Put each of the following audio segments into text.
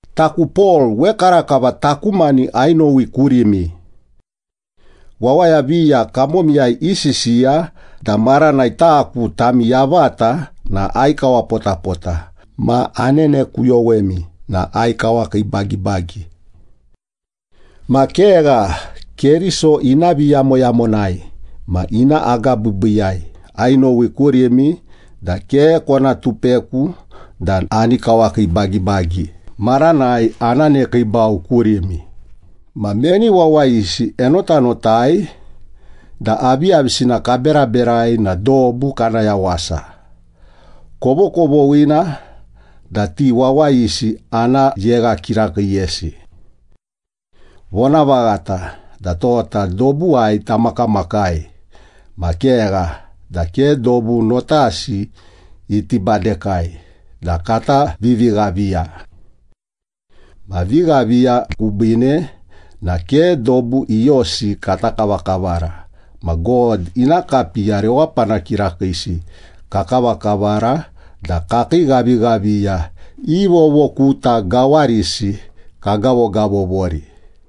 Taku Pol, wekarakava taku mani ainowi kurimi. Wawaya viya kamomiyai isisiya da maranai taku tami yavata na aikawapotapota ma anenekuyowemi na aikawakiibagibagi. Ma kegha, Keriso ina viyamoyamonai ma ina agabiibiiyai ainowi kurimi da ke kona tupeku da ani kawakiibagibagi maranai ana nekiibau kurimi. Ma meni wawayisi enotanotai da aviyavisina kaberaberai na dobu kana yawasa, kovokovoghina da ti wawayisi ana yegha kirakiiyesi. Vonavaghata da tota dobuwai tamakamakai, ma kegha da ke dobu notasi iti badekai da kata vivighaviya. Ma vighaviya kubiine na ke dobu iyosi kata kavakavara ma God ina kapiya rewapana kirakiisi kakavakavara da kakii ghavighaviya i vovokuta gawarisi kagavogavovori.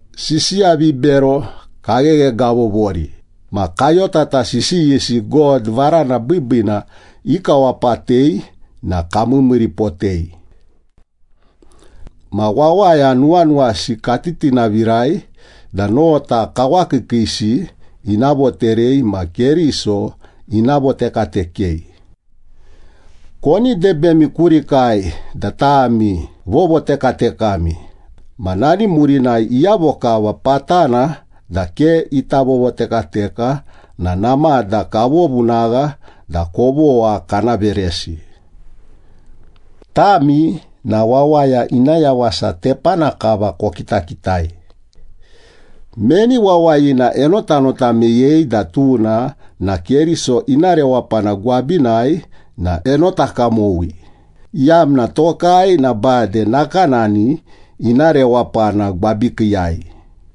Sisiya vibero kagheghegavovori ma kayotata sisiyisi God varana biibiina ikawapatei na kamiimiiripotei. Ma wawaya nuwanuwasi katitinavirai da nota kawakiikiisi ina voterei ma Keriso ina votekatekei. Koni debemi kurikai da tami vovotekatekami ma nani murinai iyavo kava patana da ke ita vovotekateka na namada kavovunagha da kovogha kana veresi. Tami na wawaya ina yawasa tepana kava kokitakitai. Meni wawayina enotanota meyei da tuna na Keriso ina rewapana gwabinai na enota kamowi, iyamna tokai na bade nakanani ina rewapana gwabikiiyai.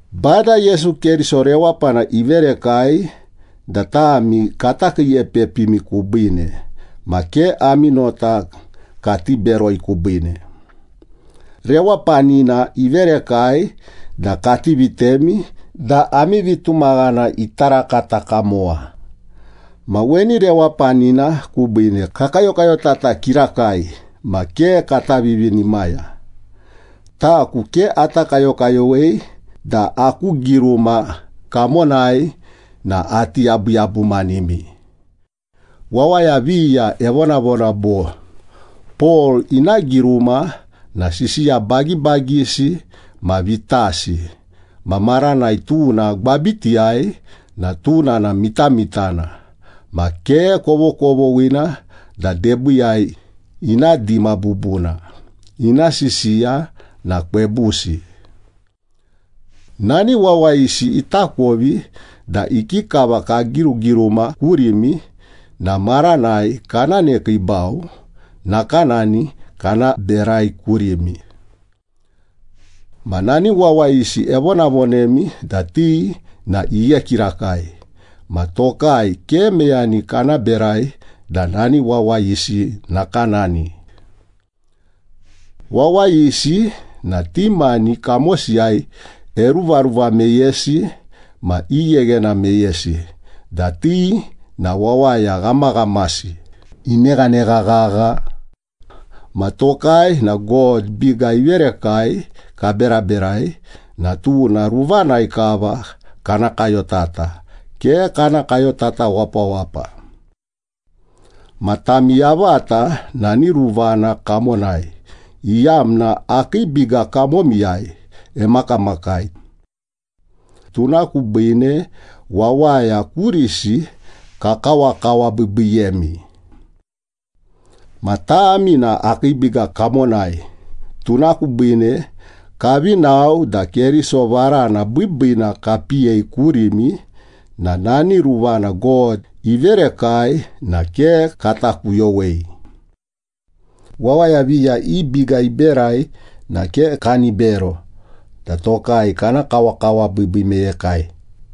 Bada Yesu Keriso rewapana iverekai da tami kata kiiepepimi kubiine ma ke ami nota kati beroi kubiine. Rewapanina iverekai da kati vitemi da ami vitumaghana ita rakata kamowa. Ma weni rewapanina kubiine kakayokayotata kirakai ma ke kata vivinimaya. Taku ke ata kayokayowei da aku giruma kamonai na ati yabuyabumanimi. Wawaya viya evonavona bo, “Pol ina giruma na sisiya bagibagisi ma vitasi, ma maranai tuna gwabitiyai na tuna na mitamitana ma ke kovokovoghina da debiiyai ina dima bubuna, ina sisiya na kwebusi.” Nani wawayisi itakovi da ikikava kagirugiruma kurimi na maranai kana nekiibau, nakanani kana berai kurimi. Ma nani wawayisi evonavonemi da ti na ighe kirakai, ma tokai ke meyani kana berai da nani wawayisi nakanani. Wawayisi na ti mani kamosiyai eruvaruva meyesi ma igheghena meyesi da ti na wawaya ghamaghamasi. Ineghanegha ghagha! Ma tokai na God biga iverekai kaberaberai na tuna ruvanai kava kana kayotata, ke kana kayotata wapawapa. Ma tami yavata nani ruvana kamonai, iyamna akii biga kamomiyai emakamakai. Tuna kubiine wawaya kurisi kakawakawabiibiiyemi. Ma tami na akii biga kamonai, tuna kubiine kavi nao da Keriso varana biibiina kapiyei kurimi na nani ruvana God iverekai na ke kata kuyowei. Wawaya viya i biga iberai na ke kani bero da tokai kana kawakawabiibii meyekai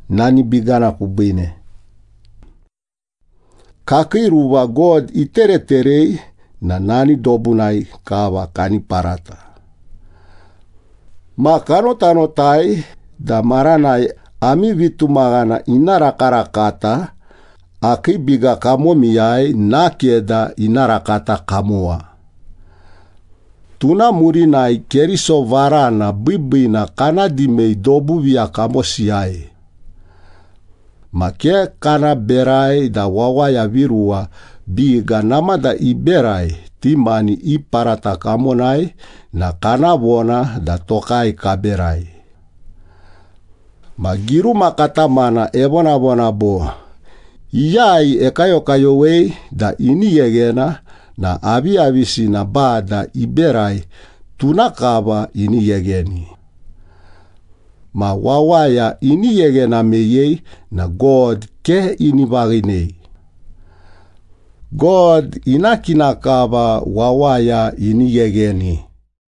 nani bigana kubiine. Kakii ruva God itereterei na nani dobunai kava kani parata. Ma kanotanotai da maranai ami vitumaghana ina rakarakata, akii biga kamomiyai nakeda ina rakata kamowa. Tuna murinai Keriso varana biibiina kana dimei dobu viya kamosiyai. Ma ke kana berai da wawaya viruwa biga namada iberai ti mani i parata kamonai na kana vona da tokai kaberai. Ma giruma katamana evonavona bo, “Iyai ekayokayowei da ini gheghena na aviyavisina Bada iberai, tuna kava ini ghegheni.” Ma wawaya ini gheghena meyei na God ke ini vaghinei. God ina kina kava wawaya ini ghegheni.